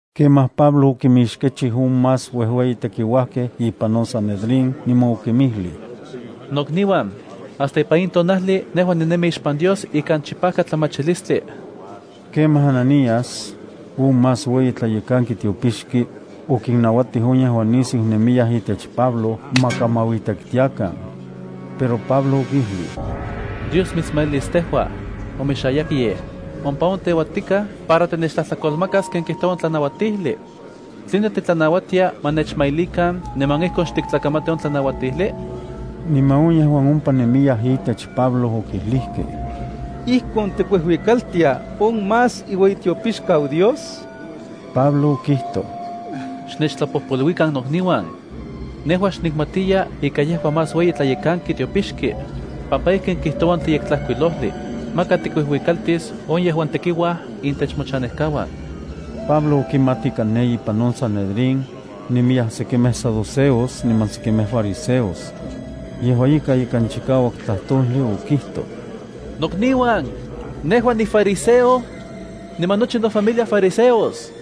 Kemaj Pablo okimixkechij on más uejueyi tekiuajkej ipan on Sanedrín niman okinmijlij: —Nokniuan, hasta ipan in tonajli nejua ninemi ixpan Dios ikan chipajkatlamachilistli. Kemaj Ananías, on más ueyitlayekanki tiopixki, okinnauatij on yejuan nisiu nemiyaj itech Pablo ma kamauitektiakan. Pero Pablo okijlij: —¡Dios mitsmailis tejua, omexayakyej! Ompa on teuatikaj para tinechtlajtlakolmakas ken kijtoua on tlanauatijli. ¿Tline titlanauatia ma nechmailikan niman ijkon xtiktlakamati on tlanauatijli? Niman on yejuan ompa nemiyaj itech Pablo okijlijkej: —¿Ijkon tikuijuikaltia on más iueyitiopixkau Dios? Pablo okijtoj: —Xnechtlapojpoluikan nokniuan. Nejua xnikmatiya ika yejua más ueyitlayekanki tiopixki, pampa ijkin kijtoua on Yektlajkuilojli: “Maka tikuijuikaltis on yejuan tekiuaj intech mochanejkauan.” Pablo okimat ika ne ipan on Sanedrín, nemiyaj sekimej saduceos niman sekimej fariseos. Yejua ika ikan chikauak tlajtojli okijtoj: —Nokniuan, nejua nifariseo niman nochi nofamilia fariseos.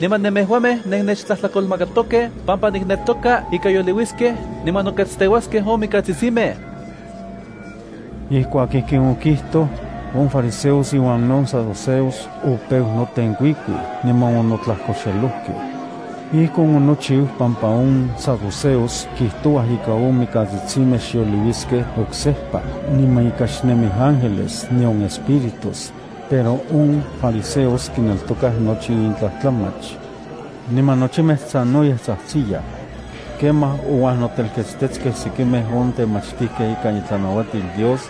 Niman nemejuamej nennechtlajtlakolmakatokej pampa nikneltoka ika yoliuiskej niman noketsteuaskej on mikatsitsimej. Ijkuak ijkin okijtoj, on fariseos iuan on saduceos opeu notenkuikuij niman onotlajkoxelojkej. (Ijkon onochiu pampa on saduceos kijtouaj ika on mikatsitsimej xyoliuiskej oksejpa niman ika xnemij ángeles nion espíritus, pero on fariseos kineltokaj nochi in tlajtlamach.) Niman nochimej sanoyej tsajtsiyaj. Kemaj ouajnotelketstejkej sekimej on temachtijkej ikan itlanauatil Dios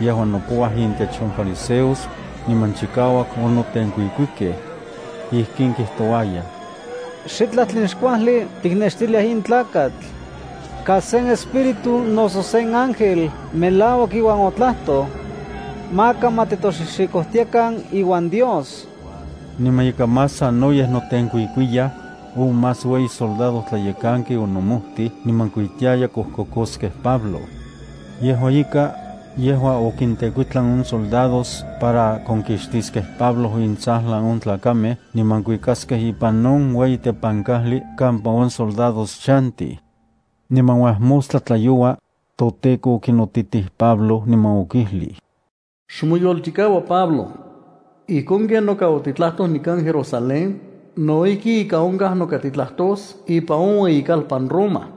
yejuan nopouaj intech on fariseos, niman chikauak onotenkuikuikej. Ijkin kijtouayaj: —Xitlaj tlen xkuajli tiknextiliaj in tlakatl. Kas sen espíritu noso sen ángel melauak iuan otlajtoj. Maka ma titoxixikojtiakan iuan Dios. Niman ika más sanoyej notenkuikuiyaj, on más ueyi soldadojtlayekanki onomojtij niman kuitiaya kojkokoskej Pablo. Yejua ika, yejua okintekuitlan on soldados para konkixtiskej Pablo intsajlan on tlakamej niman kuiskakej ipan on ueyi tepankajli kampa on soldados chantij. Niman uajmostla tlayoua, toTEKO okinotitij Pablo niman okijlij: —Xmoyolchikaua Pablo. Ijkon ken noka otitlajtoj nikan Jerusalén, no ijki ika onkaj noka titlajtos ipan on ueyikalpan Roma.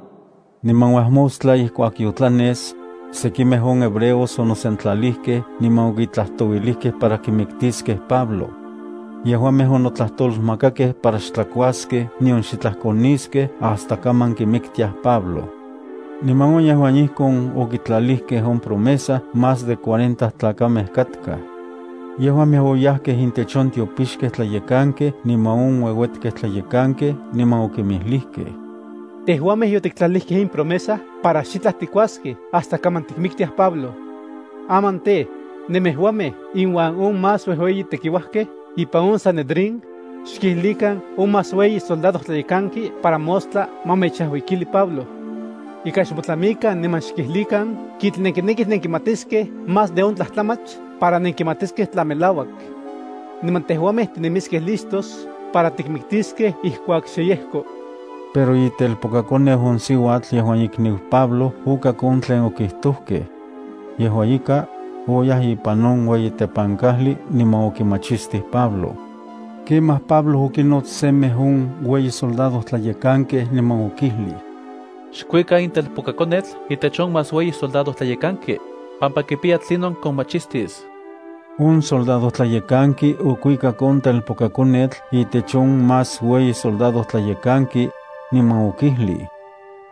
Niman uajmostla ijkuak yotlanes, sekimej on hebreos onosentlalijkej niman okitlajtouilijkej para kimiktiskej Pablo. Yejuamej okitlajtolmakakej para xtlakuaskej nion xitlaj koniskej hasta kaman kimiktiaj Pablo. Niman on yejuan ijkon okitlalijkej on promesa más de cuarenta tlakamej katkaj. Yejuamej oyajkej intech on tiopixkej tlayekankej niman on ueuetkej tlayekankej niman okinmijlijkej: —Tejuamej yotiktlalijkej in promesa para xitlaj tikuaskej hasta kaman tikmiktiaj Pablo. Aman tej, nemejuamej inuan on más uejueyi tekiuajkej ipan on Sanedrín, xkijlikan on más ueyi soldadojtlayekanki para mostla ma mechajuikili Pablo. Ika xmotlamikan niman xkijlikan kitl nenkinekij nenkimatiskej más de on tlajtlamach para nenkimatiskej tla melauak. Niman tejuamej tinemiskej listos para tikmiktiskej ijkuak xe yejko. Pero itelpokakoneu on siuatl yejuan ikniu Pablo okak on tlen okitojkej. Yejua ika, oyaj ipan on ueyi tepankajli niman okimachistij Pablo. Kemaj Pablo okinots semej on ueyi soldadojtlayekankej niman okijlij: —Xkuika in telpokakonetl itech on más ueyi soldadojtlayekanki, pampa kipiya tlinon komachistis. On soldadojtlayekanki okuikak on telpokakonetl itech on más ueyi soldadojtlayekanki, niman okijlij: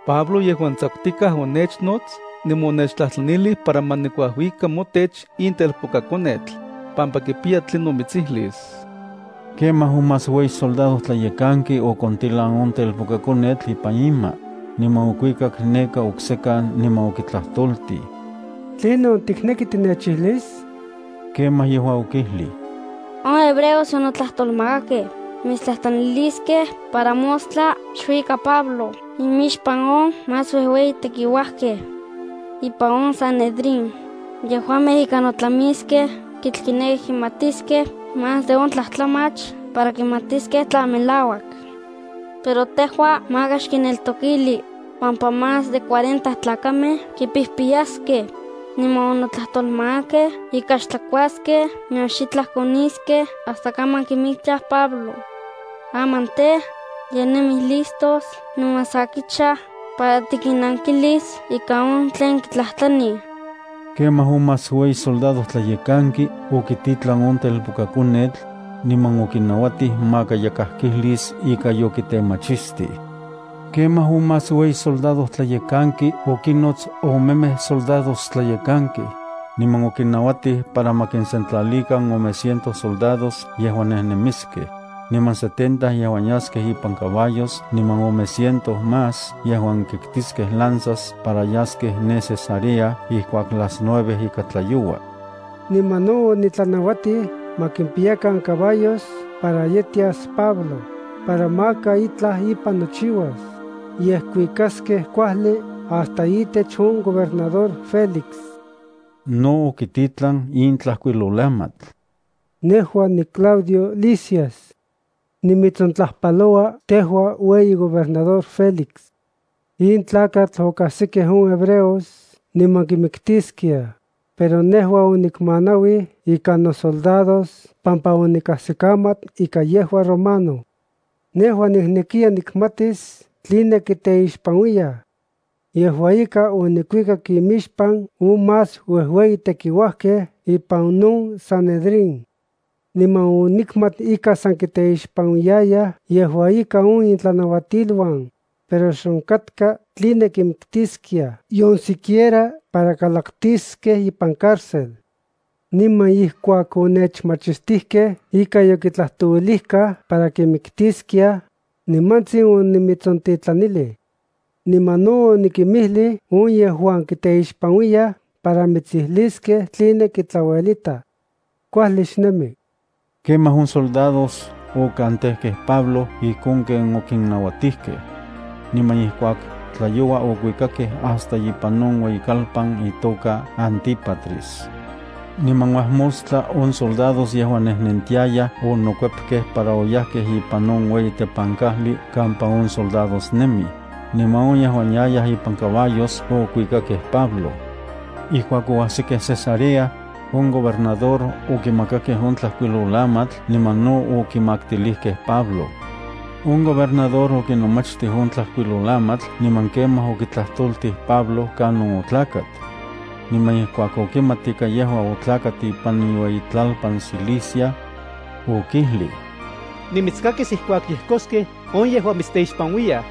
—Pablo yejuan tsakutikaj onechnots niman onechtlajtlanilij para ma nikuajuika motech in telpokakonetl, pampa kipiya tlinon mitsijlis. Kemaj on más ueyi soldadojtlayekanki okontilan on telpokakonetl ipan ima, niman okuikak neka oksekan niman okitlajtoltij: —¿Tlinon tikneki tinechijlis? Kemaj yejua okijlij: —On hebreos yonotlajtolmakakej mitstlajtlaniliskej para mostla xkuika Pablo imixpan on más uejueyi tekiuajkej ipan on Sanedrín, yejuamej ika notlamiskej kitl kinekij kimatiskej más de on tlajtlamach para kimatiskej tla melauak. Pero tejua maka xkinneltokili, pampa más de cuarenta tlakamej kipijpiyaskej, niman onotlajtolmakakej ika xtlakuaskej nion xitlaj koniskej hasta kaman kimiktiaj Pablo. Aman tej, ye nemij listos niman sa kichaj para tikinnankilis ika on tlen kitlajtlanij. Kemaj on más ueyi soldadojtlayekanki okititlan on telpokakonetl, niman okinauatij maka yakaj kijlis ika yokitemachistij. Kemaj on más ueyi soldadojtlayekanki okinnots omemej soldadojtlayekankej, niman okinnauatij para ma kisentlalikan ome ciento soldados yejuan nejnemiskej, niman setenta yejuan yaskej ipan caballos niman ome ciento más yejuan kitkiskej lanzas para yaskej ne Cesarea ijkuak las nueve ika tlayoua. Niman no otlanauatij ma kimpiyakan caballos para yetias Pablo, para maka itlaj ipan nochiuas, yej kuikaskej kuajli hasta itech on gobernador Félix. No okititlan in tlajkuilolamatl: Nejua niClaudio Lisias. Nimitsontlajpaloua tejua ueyi gobernador Félix. In tlakatl okajsikej on hebreos niman kimiktiskiaj, pero nejua onikmanauij ikan nosoldados pampa onikajsikamat ika yejua romano. Nejua niknekiya nikmatis tline kiteixpanuiyaj. Yejua ika, onikuikak imixpan on más uejueyi tekiuajkej ipan on Sanedrín. Niman onikmat ika san kiteixpanuiyaj yejua ika on intlanauatiluan, pero xonkatka tline kimiktiskiaj nion siquiera para kalaktiskej ipan cárcel. Niman ijkuak onechmachistijkej ika yokitlajtoluikaj para kimiktiskiaj, nimantsin onimitsontitlanilij. Niman no onikimijlij on yejuan kiteixpanuiyaj para mitsijliskej tline kitlauelitaj. Kuajli xnemi. Kemaj on soldados okantekej Pablo ijkon ken okinnauatijkej. Niman ijkuak tlayoua okuikakej hasta ipan on ueyikalpan itoka Antípatris. Niman uajmostla on soldados yejuan nejnentiayaj onokuepkej para oyajkej ipan on ueyi tepankajli kampa on soldados nemij, niman on yejuan yayaj ipan caballos okuikakej Pablo. Ijkuak oajsikej Cesarea, on gobernador okimakakej on tlajkuilolamatl niman no okimaktilijkej Pablo. On gobernador okinomachtij on tlajkuilolamatl niman kemaj okitlajtoltij Pablo kanon otlakat. Niman ijkuak okimat ika yejua otlakat ipan iueyitlalpan Cilicia, okijlij: —Nimitskakis ijkuak yejkoskej on yejuan mitsteixpanuiyaj.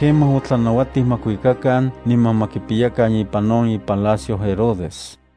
Kemaj otlanauatij ma kuikakan niman ma kipiyakan ipan on ipalacio Herodes.